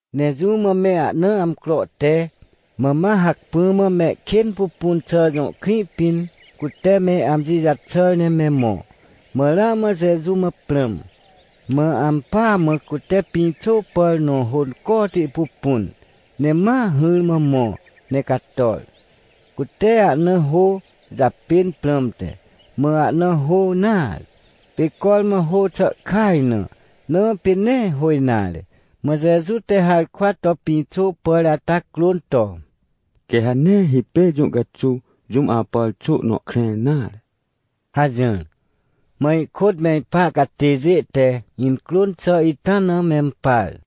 Ne jũ mã me ahna amcro te, mã ma hacpỹ mã Mehkênpupunxà jõ krĩ pĩn cute me amji jaxàr ne me mõ, mã ramã Jeju mã prãm. Mã ampỳa mã cute pĩxô pàr nõ hôncoti pupun, ne ma hỹrmã mõ ne cator, cute ahna hô japên prãmte, mã ahna hô nare. Pê cormã hô xà kaj na, na pê nee hô nare. Mã Jeju te harkwa to pĩxô pàr ata crôn to: — Quê ha nee hipêr jũ caxuw jũm apàr xô nõ krẽr nare — hajỹr. Mã ihkôt me ipa catêjê te incrôn xà ita na mempar.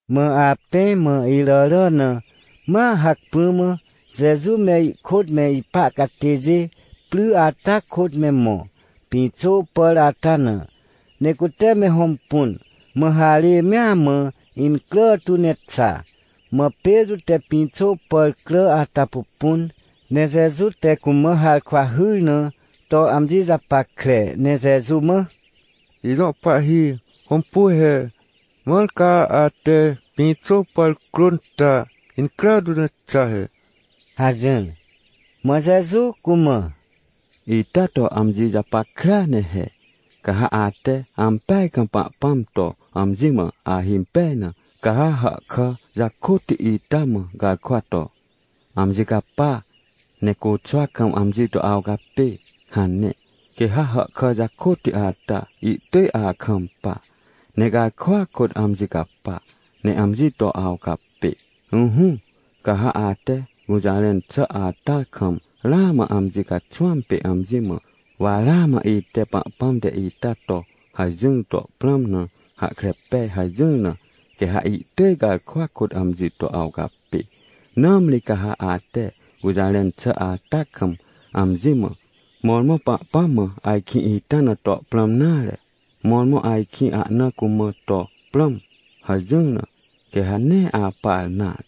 Mã apẽ mã iràrà na, ma hacpỹ mã Jeju me ihkôt me ipa catêjê pry ata kôt me mõ, pĩxô pàr ata na, ne cute me hõmpun, mã harê mea mã incrà tu ne xa. Mã Petrô te pĩxô pàr crà ata pupun, ne Jeju te cumã harkwa hyr na to amji japackre ne Jeju mã: — Ijõ Pahhi, hõmpu he, mãr ca ate pĩxô pàr crôn ta, incrà tu ne xa he — hajỹr. Mã Jeju cumã: — Ita to amji japackrea ne he, ca ha ate ampeaj kam Pahpãm to amji mã ahimpej na, ca ha hàhkà jakôtti ita mã garkwa to: “Amji capa, ne côxwa kam amji to awcapê” hane, quê ha hàhkà jakôtti ata ihtỳj akampa, ne garkwa kôt amji capa ne amji to awcapê. Ỹhỹ, ca ha ate gũjarẽn xà ata kam ramã amji caxwãm pê amji mã: “Wa ramã ite Pahpãm te ita to hajỹr to prãm na hahkre pej” hajỹr na, quê ha ihtỳj garkwa kôt amji to awcapê. Nãmri ca ha ate gũjarẽn xà ata kam, amji mã: “Mõrmõ Pahpãm mã ajkĩ ita na to prãm nare, mõrmõ ajkĩ ahna cumã to prãm” hajỹr na, quê ha nee apar nare.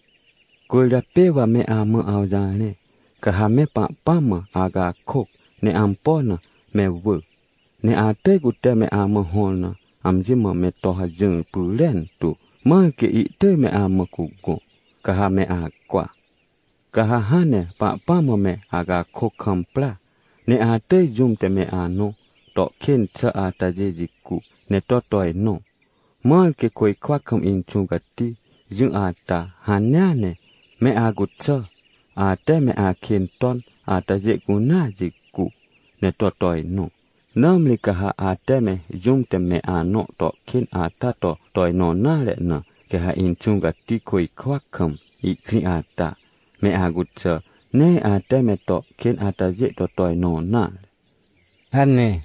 — Cwỳrjapê wa me amã awjarẽ, ca ha me Pahpãm mã acakôc ne ampo na me wỳ, ne atỳj cute me amã hõr na amji mã me to hajỹr pyrentu, mãr quê ihtỳj me amã cugõ, ca ha me acwa. Ca ha hãn ne Pahpãm mã me acakôc kam pra, ne atỳj jũm te me anõ to kên xà atajê jicu, ne to tojnõ, mãr quê côjkwa kam Inxũ Cati jỹ ata hanea ne, me acuxà, ate me akên ton atajê cunea jicu, ne to tojnõ. Nãmri ca ha ate me jũm te me anõ to kên ata to tojnõ nare na, quê ha Inxũ Cati, côjkwa kam ihkrĩ ata, me acuxà, nee ate me to kên atajê to tojnõ nare — hane.